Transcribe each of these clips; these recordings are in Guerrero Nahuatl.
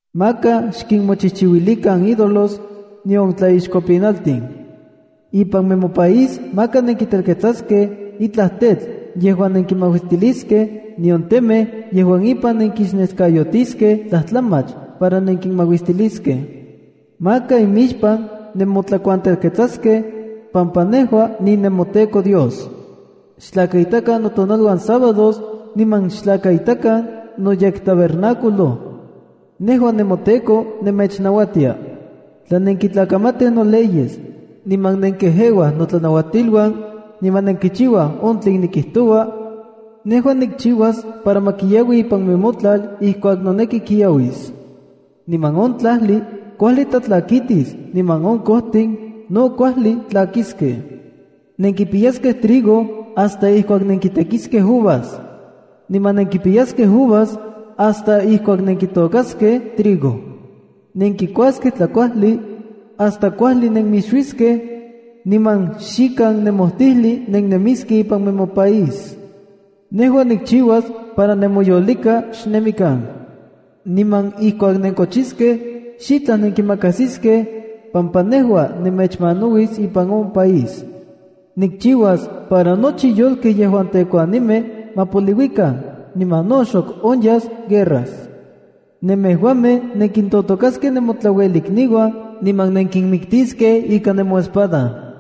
’Maka xkinmochijchiuilikan ídolos, nion tlaixkopinaltin. Ipan nemopaís maka nenkitelketsaskej itlaj tetl yejuan nenkimauistiliskej, nion temej yejuan ipan nenkixneskayotiskej tlajtlamach para nenkimauistiliskej. Maka imixpan nemotlakuantelketsaskej, pampa nejua ninemoTEKO Dios. Xtlakaitakan notonaluan sabádos, niman xtlakaitakan noyektabernáculo. Nejua nemoTEKO nemechnauatia. ’Tla nenkintlakamatij noleyes, niman nenkejeuaj notlanauatiluan, niman nenkichiuaj on tlen nikijtoua, nejua nikchiuas para ma kiaui ipan nemotlal ijkuak noneki kiauis. Niman on tlajli kuajli tlatlakitis, niman on kojtin no kuajli tlakiskej. Nenkipiyaskej trigo hasta ijkuak nenkitekiskej uvas, niman nenkipiyaskej uvas hasta ijkuak nenkitôkaskej trigo. Nenkikuaskej tlakuajli hasta kuajli nenmixuiskej, niman xikan nemojtijli nennemiskej ipan nemopaís. Nejua nikchiuas para nemoyolika xnemikan. Niman ijkuak nenkochiskej xitlaj nenkimakajsiskej, pampa nejua nemechmanauis ipan on país. Nikchiuas para nochi yolkej yejuan tekuanimej ma poliuikan, niman no xok onyas guerras. Nemejuamej nenkintotokaskej nemotlauelikniuan niman nenkinmiktiskej ika nemoespada.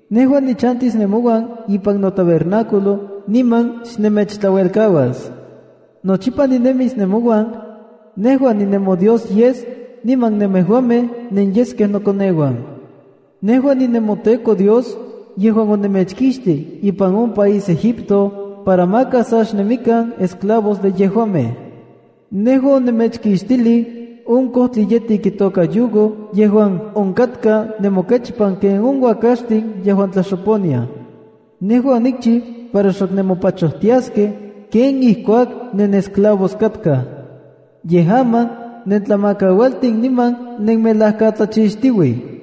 ’Nejua nichantis nemouan ipan noTabernáculo niman xnemechtlauelkauas. Nochipa ninemis nemouan. Nejua ninemoDios yes niman nemejuamej nenyeskej nokoneuan. Nejua ninemoTEKO Dios yejuan onemechkixti ipan on país Egipto para maka sa xnemikan esclavos de yejuamej. Nejua onemechkixtilij on kojtli yetik itoka yugo yejuan onkatka nemokechpan ken on uakaxtin yejuan tlaxoponiaj. Nejua onikchiu para xok nemopachojtiaskej ken ijkuak nenesclavos katkaj. Yej aman nentlamakaualtin, niman nenmelajkatlachixtiuij.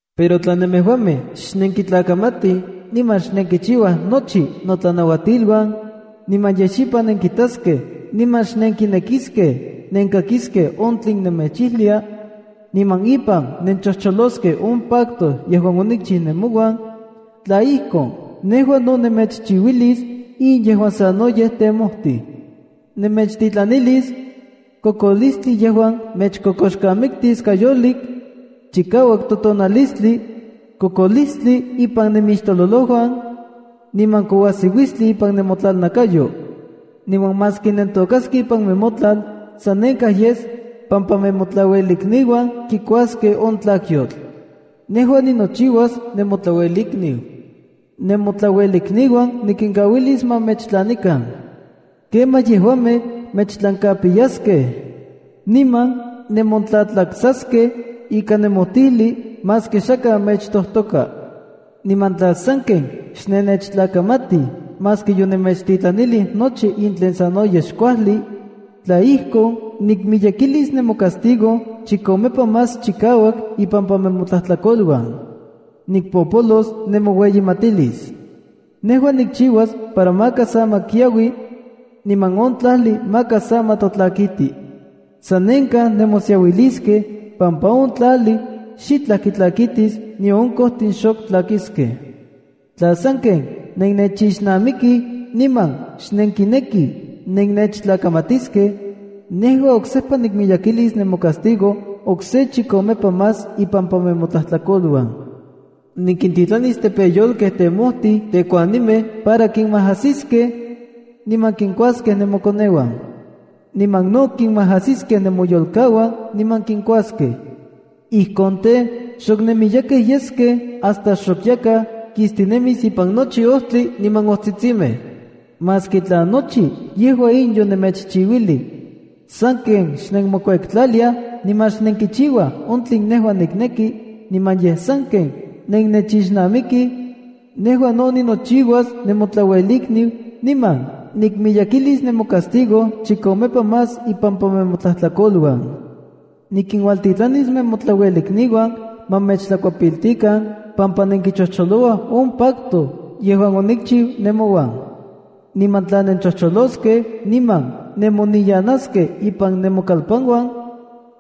’Pero tla nemejuamej xnenkitlakamatij niman xnenkichiuaj nochi notlanauatiluan, niman yej xipan nenkitaskej niman xnenkinekiskej nenkakiskej on tlen nemechijlia, niman ipan nenchojcholoskej on pacto yejuan onikchiu nemouan, tla ijkon, nejua no nemechchiuilis in yejuan sanoyej temojtij. Nemechtitlanilis: kokolistli yejuan mechkokoxkamiktis kayolik, chikauak totonalistli, kokolistli ipan nemixtololojuan, niman kouajsiuistli ipan nemotlalnakayo. Niman maski nentôkaskej ipan nemotlal, sanenkaj yes, pampa nemotlauelikniuan kikuaskej on tlakyotl. Nejua ninochiuas nemotlauelikniu. Nemotlauelikniuan nikinkauilis ma mechtlanikan. Kemaj yejuamej mechtlankapiyaskej. Niman nemontlatlaksaskej ikan nemojtijli maski xakaj mechtojtoka. ’Niman tla sanken xnenechtlakamatij maski yonemechtitlanilij nochi in tlen sanoyej xkuajli, tla ijkon, nikmiyekilis nemocastigo chikomepa más chikauak ipampa nemotlajtlakoluan. Nikpopolos nemoueyimatilis. Nejua nikchiuas para maka sa ma kiaui, niman on tlajli maka sa ma tlatlakiti. Sanenkaj nemosiauiliskej, pampa on tlajli xitlaj kitlakitis nion on kojtin xok tlakiskej. ’Tla sanken nennechixnamikij niman xnenkinekij nennechtlakamatiskej, nejua oksejpa nikmiyekilis nemocastigo okse chikomepa más ipampa nemotlajtlakoluan. Nikintitlanis tepeyolkej temojtij tekuanimej para kinmajasiskej niman kinkuaskej nemokoneuan. Niman no kinmajasiskej nemoyolkauan niman kinkuaskej. Ijkon tej, xok nenmiyekej yeskej hasta xok yakaj kistinemis ipan nochi ojtli niman ojtsitsimej. “Maski tla nochi yejua in yonemechchiuilij, sanken xnenmokuektlaliaj niman xnenkichiuaj on tlen nejua nikneki niman yej sanken nennechixnamikij, nejua no ninochiuas nemotlauelikniu niman nikmiyekilis nemocastigo chikomepa más ipampa nemotlajtlakoluan. Nikinuajtitlanis nemotlauelikniuan ma mechtlakuepiltikan pampa nenkichojcholouaj on pacto yejuan onikchiu nemouan. Niman tla nenchojcholoskej niman nemoniyanaskej ipan nemokalpanuan,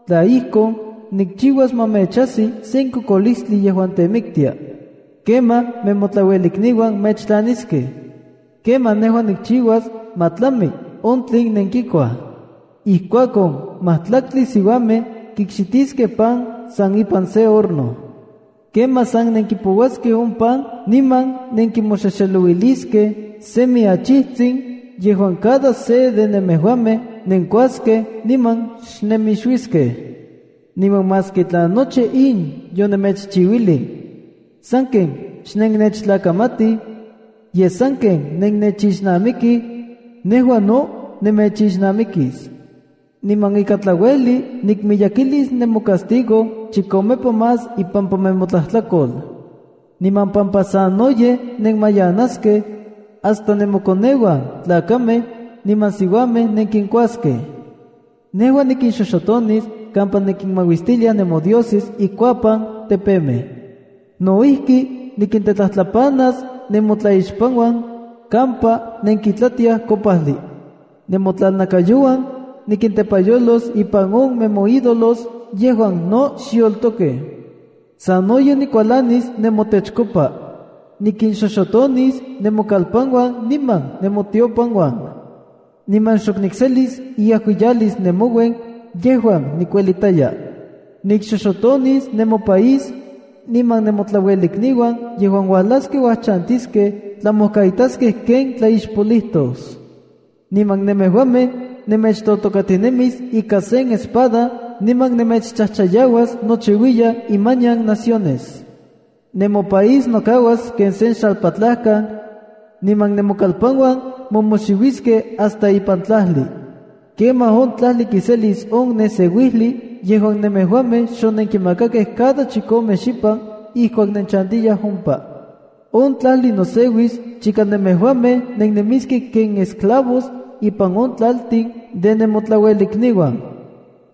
tla ijkon, nikchiuas ma mechajsi sen kokolistli yejuan temiktia. Kemaj nemotlauelikniuan mechtlaniskej. ’Kemaj nejua nikchiuas ma tlami on tlen nenkikuaj. Ijkuakon majtlaktli siuamej kikxitiskej pan san ipan se horno. Kemaj san nenkipouaskej on pan niman nenkimoxexelouiliskej semi achijtsin yejuan cada se de nemejuamej nenkuaskej niman xnemixuiskej. ’Niman maski tla nochi in yonemechchiuilij, sanken xnennechtlakamatij, yej sanken nennechixnamikij, nejua no nemechixnamikis. Niman ikan tlauejli nikmiyekilis nemocastigo chikomepa más ipampa nemotlajtlakol. Niman pampa sanoyej nenmayanaskej, hasta nemokoneuan tlakamej niman siuamej nenkinkuaskej. Nejua nikinxoxotonis kampa nenkimauistiliaj nemodioses ikuapan tepemej. No ijki, nikintetlajtlapanas nemotlaixpanuan kampa nenkitlatiaj kopajli. Nemotlalnakayouan nikintepayolos ipan on nemoídolos yejuan no xyoltokej. Sanoyej nikualanis nemotechkopa. Nikinxoxotonis nemokalpanuan niman nemotiopanuan, niman xok nikselis inajuiyalis nemouen yejuan nikuelitaya. ’Nikxoxotonis nemopaís, niman nemotlauelikniuan yejuan uajlaskej uajchantiskej tlamojkaitaskej ken tlaixpolijtos. Niman nemejuamej nemechtotokatinemis ika sen espada niman nemechchajchayauas nochiuiyan imanian naciones. Nemopaís nokauas ken sen xalpatlajkan, niman nemokalpanuan momoxiuiskej hasta ipan tlajli. Kemaj on tlajli kiselis on neseuijli yejuan nemejuamej xonenkimakakej cada chikomej xipan ijkuak nenchantiyaj ompa. On tlajli noseuis chika nemejuamej nennemiskej ken esclavos ipan on tlaltin de nemotlaluelikniuan.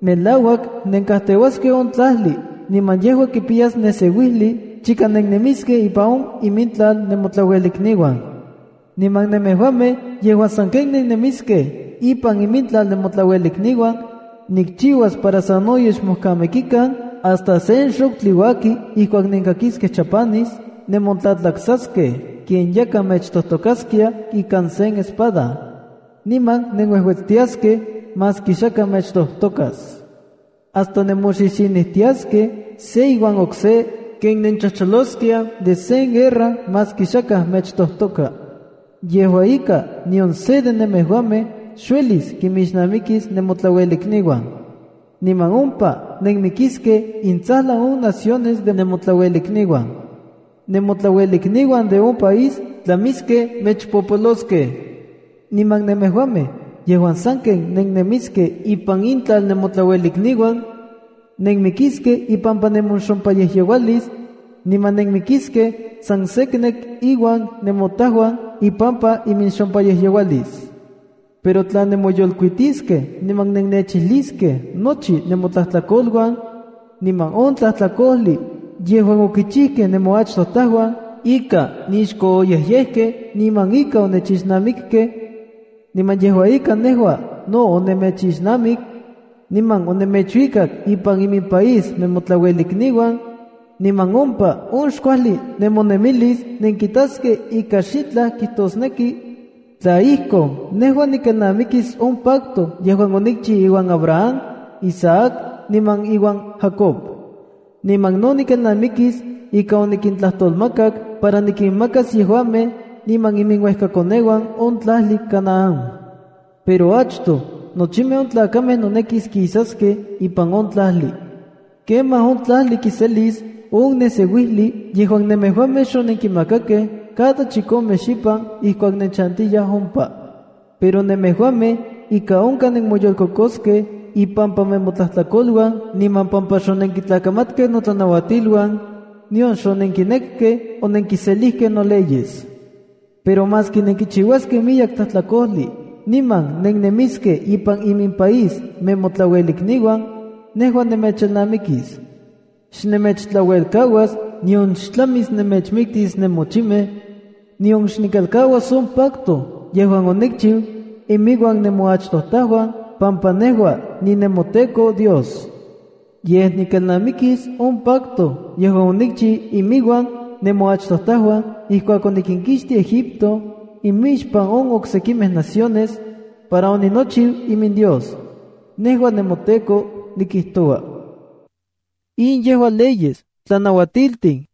Melauak nenkajteuaskej on tlajli niman yejua kipiyas neseuijli chika nennemiskej ipan imintlal nemotlauelikniuan. ’Niman nemejuamej yejuan sanken nennemiskej ipan imintlal nemotlauelikniuan, nikchiuas para sanoyej xmojkamikikan hasta sen xojtli uaki ijkuak nenkakiskej chapanis nemontlatlaksaskej ken yakaj mechtojtokaskia ikan sen espada, niman nenuejuetstiaskej maski xakaj mechtojtokas. Hasta nemoxixinijtiaskej se iuan okse ken nenchojcholoskiaj de sen guerra maski xakaj mechtojtoka. Yejua ika, nion se de nemejuamej xuelis kimixnamikis nemotlauelikniuan. Niman ompa nenmijmikiskej intsajlan on naciones de nemotlauelikniuan. Nemotlauelikniuan de on país tlamiskej mechpopoloskej. Niman nemejuamej yejuan sanken nennemiskej ipan intlal nemotlauelikniuan, nenmikiskej ipampa nemoxompayejyeualis, niman nenmikiskej san seknek iuan nemotajuan ipampa iminxompayejyeualisa. ’Pero tla nemoyolkuitiskej niman nennechijliskej nochi nemotlajtlakoluan, niman on tlajtlakojli yejuan okichijkej nemoachtojtauan ika nixkooyejyejkej niman ika onechixnamikkej, niman yejua ika nejua no onemechchixnamik, niman onemechuikak ipan iminpaís nemotlauelikniuan, niman ompa on xkuajli nemonemilis nenkitaskej ika xitlaj kijtosneki, tla ijkon, nejua nikelnamikis on pacto yejuan onikchiu iuan Abraham, Isaac niman iuan Jacob. Niman no nikelnamikis ika onikintlajtolmakak para nikinmakas yejuamej niman iminuejkakoneuan on tlajli Canáan. Pero achtoj, nochimej on tlakamej nonekis kisaskej ipan on tlajli. Kemaj on tlajli kiselis on neseuijli yejuan nemejuamej xonenkimakakej cada chikomej xipan ijkuak nenchantiyaj ompa. Pero nemejuamej ika onkaj nenmoyolkokoskej ipampa nemotlajtlakoluan niman pampa xonenkitlakamatkej notlanauatiluan, nion xonenkinekej onenkiselijkej noleyes. ’Pero maski nenkichiuaskej miyek tlajtlakojli niman nennemiskej ipan imimpaís nemotlauelikniuan, nejua nemechelnamikis. Xnemechtlauelkauas, nion xtlamis nemechmiktis nemochimej, nion xnikelkauas on pacto yejuan onikchiu inmiuan nemoachtojtauan pampa nejua ninemoTEKO Dios. Yej, nikelnamikis on pacto yejuan onikchiu iminuan nemoachtojtauan ijkuak onikinkixtij Egipto imixpan on oksekimej naciones, para oninochiu iminDios. Nejua nemoTEKO nikijtoua.” In yejua leyes, tlanauatiltin,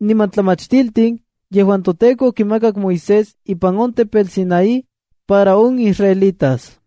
niman tlamachtiltin yejuan toTEKO okimakak Moisés ipan on tepetl Sinaí para on israelitas.